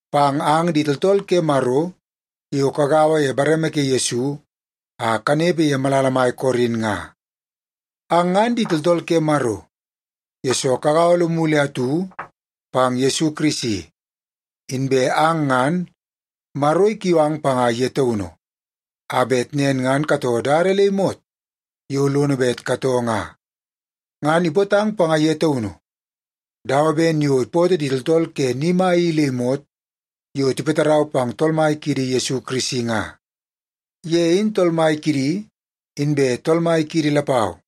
pang ang di tooltool ke Maro yo kagaua ye bareme ke Yesu a kanepe ye malala mai Korin nga. Ang ngan di tooltool ke Maro, yesoo kagaua lomu le atu pang Yesu Kirisi. Inbe ang ngan, Maro ikiu ang panga ye taunu, a bet nen ngan katoo dada le imot yo lono bet katoo nga. Ngan ipootang panga ye taunu dawa ben yo ipootoo di tooltool ke ni mai i le imot yo tipatarau pang Tool Mai kiidi Yesu Kirisi nga. Ye in Tool Mai kidi, inbe Tool Mai kiidi lapau.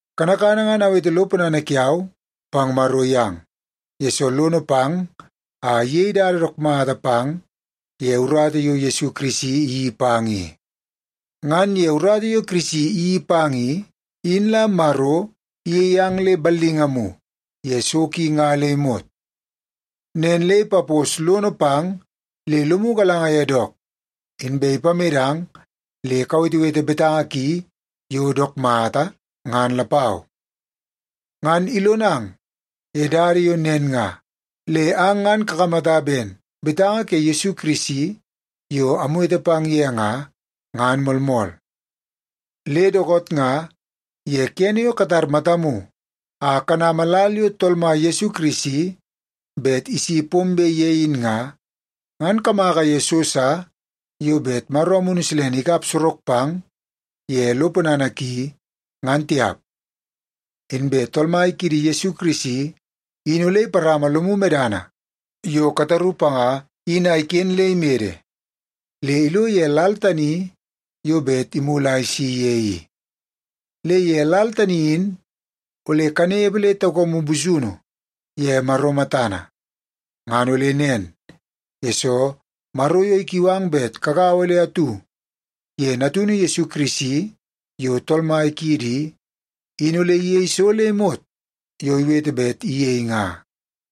Kanakana ngan awete lo ponana kiau pang Maro yang, yesoo lono pang a iyei dada dook mata pang ye urata yo Yesu Kirisi iyeii pang i. Ngan ye urata yo Kirisi iyeii pang i, in la Maro iyei ang le ballingamu ye so ki nga le imot. Nen le ipapos lono pang le lomu galanga ye dook, inbe ipamedang le kawetewete betanga ki yo dook mata, ngan lapau. Ngan ilonang ye dada yo nen nga le ang ngan kakamata ben betanga ke Yesu Kirisi yo amwete pang ye nga, ngan moolmool. Le dookoot nga ye kene yo katar matamu a kanama lal yo Tool Mai Yesu Kirisi bet isi pombe ye in nga, ngan kamaka ye so sa yo bet Maro Amunu Silene ikap sorok pang ye lo ponana ki, ngan tiap. Inbe Tool Mai kiidi Yesu Kirisi in ole iparama lomu medana yo kataru panga in a iken le imede le ilo ye lal tani yo bet imulu a isi ye i. Le ye lal tani in ole kanepe le taukamu busunu ye Maro matana. Ngan ole nen, yesoo Maro yo ikiu ang bet kagaua le atu ye Natunu Yesu Kirisi yo Tool Mai kiidi i, in ole iyei so le imot yo iwete bet iyei nga.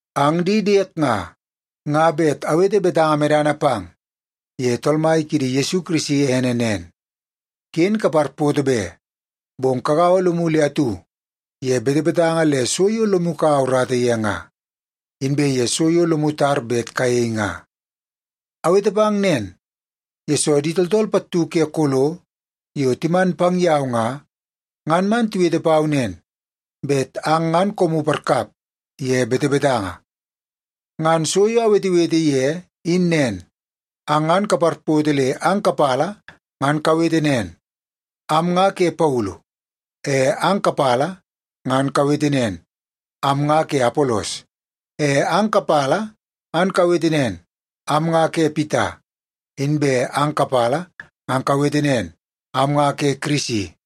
Ang di diek nga, nga bet awete betanga medana pang ye Tool Mai kiidi Yesu Kirisi ene nen. Ken kaparpoto be, bong kagaua lomu le atu ye betebetanga le so yo lomu kaua urata ye nga, inbe ye so yo lomu tar bet kayei nga. Awete pang nen, yesoo di tooltool pattu ke Kolo yo timan pang yau nga, ngan man tiwete pau nen bet ang ngan koomu parkap ye betebetanga. Ngan so yo awetewete ye in nen, ang ngan kaparpoto le ang kapala ngan kawete nen, “Am nga ke Paulu.” E ang kapala ngan kawete nen, “Am nga ke Apolos.” E ang kapala ngan kawete nen, “Am nga ke Pita.” Inbe ang kapala ngan kawete nen, “Am nga ke Kirisi.”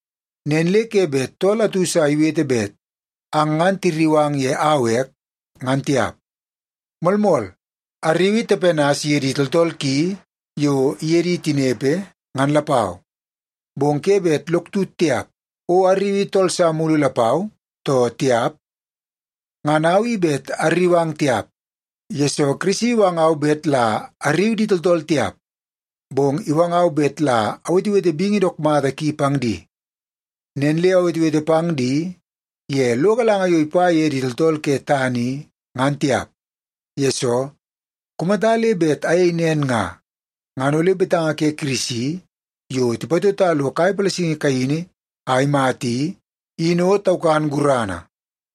Nen le ke bet tool atu sa iwete bet ang ngan tirriu ang ye au ek, ngan tiap. Moolmool, arriui Tepanas iye di tooltool ki yo iye di tinepe, ngan lapau. Bong ke bet lok tut tiap, o arriui tool sa mulu lapau, too tiap. Ngan au i bet arriu ang tiap, yesoo Kirisi iwangau bet la arriu di tooltool tiap, bong iwangau bet la awetewete bingi dook mata ki pang di. Nen le awetewete pang di ye lo galanga yo ipa ye di tooltool ke tana i, ngan tiap. Yesoo, kumata le bet ayei nen nga, ngan ole betanga ke Kirisi yo tipatota lo kai palasingi kaini a imata i, in o taukan gurana.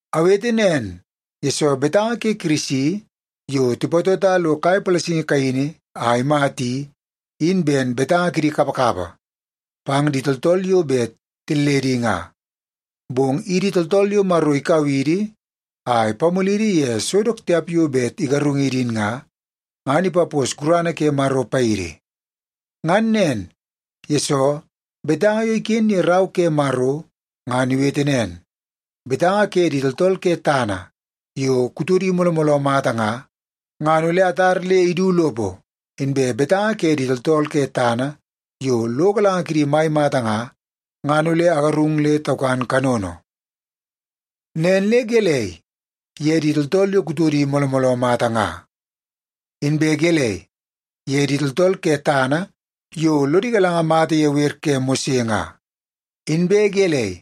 Awete nen, yesoo betanga ke Kirisi yo tipatota lo kai palasingi kaini a imata i, in ben betanga kidi kapakapa pang di tooltool yo bet tilledi nga. Bong idi tooltool yo Maro ikau idi a ipamulidi ye so dook tiap yo bet igarungidi in nga, ngan ipapos gurana ke Maro paidi. Ngan nen, yesoo betanga yo iken ye Rau ke Maro ngan iwete nen, “Betanga ke di tooltool ke tana yo kutodi mooloo mooloo mata nga, ngan ole atar le idu lopo. Inbe betanga ke di tooltool ke tana yo lo galanga kidi mai mata nga, ngan ole agarung le taukan kanono.” Nen le gelei ye di tooltool yo kutodi mooloo mooloo mata nga? Inbe gelei ye di tooltool ke tana yo lodi galanga mata ye wer ke Mose nga? Inbe gelei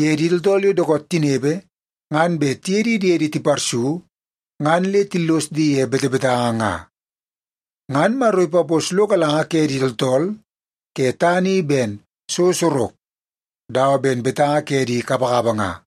ye di tooltool yo dookoot tinepe ngan bet tiye di diedi tiparsu ngan le tillos di ye betebetanga nga? Ngan Maro ipapos lo galanga ke di tooltool ke tana i ben so sorok dawa ben betanga ke di kapakapa nga.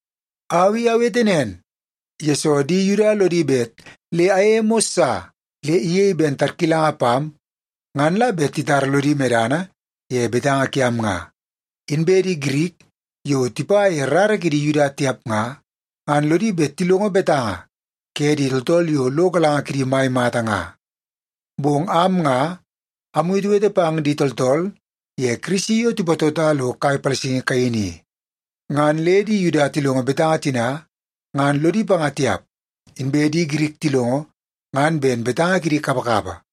Au i awete nen, yesoo di Yuda lodi bet le amyei mos sa le iyei ben tarkilanga pam ngan la bet titara lodi medana ye betanga kiam nga. Inbe di Girik yo tipa ye rara kidi Yuda tiap nga, ngan lodi bet tilongo betanga ke di tooltool yo lo galanga kidi mai mata nga. Bong am nga amwetewete pang di tooltool ye Kirisi yo tipatota lo kai palasingi kaini i. Ngan le di Yuda tilongo betanga tina ngan lodi panga tiap. Inbe di Girik tilongo ngan ben betanga kidi kapakapa.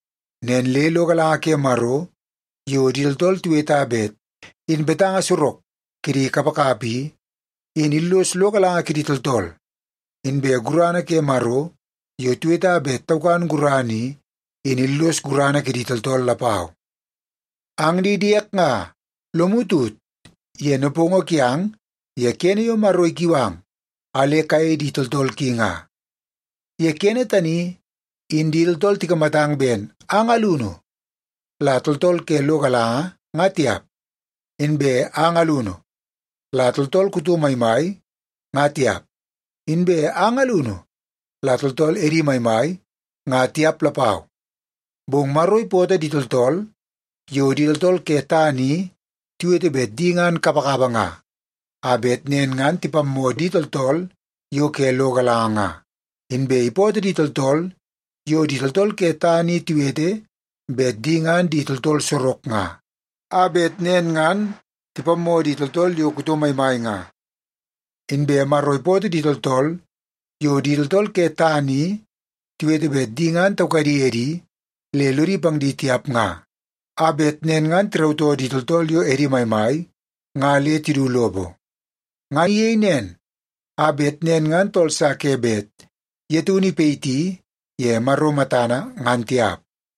Nen le lo galanga ke Maro yo di tooltool tiweta bet in betanga sorok kidi kapakapa i, in illos lo galanga kidi tooltool. Inbe gurana ke Maro yo tiweta bet taukan gurana i, in illos gurana kidi tooltool lapau. Ang di diek nga, lomu tut ye nepongo kiang ye kene yo Maro ikiu ang a le kayei di tooltool ki nga. Ye kene tani in di tooltool tikamatang ben ang alunu la tooltool ke lo galanga nga tiap. Inbe ang alunu la tooltool kuto maimai nga tiap, inbe ang alunu la tooltool edi maimai nga tiap lapau. Bong Maro ipootoo di tooltool yo di tooltool ke tana i tiwete bet di ngan kapakapa nga, a bet nen ngan tipammoo di tooltool yo ke lo galanga nga. Inbe ipootoo di tooltool yo di tooltool ke tana i tiwete bet di ngan di tooltool sorok nga, a bet nen ngan tipammoo di tooltool yo kuto maimai nga. Inbe Maro ipootoo di tooltool yo di tooltool ke tana i tiwete bet di ngan taukadi edi le lodi pang di tiap nga, a bet nen ngan tirautoo di tooltool yo edi maimai nga le tidu lopo. Ngan iyei nen, a bet nen ngan tooltool sa ke bet ye taunu ipayiti ye Maro matana, ngan tiap.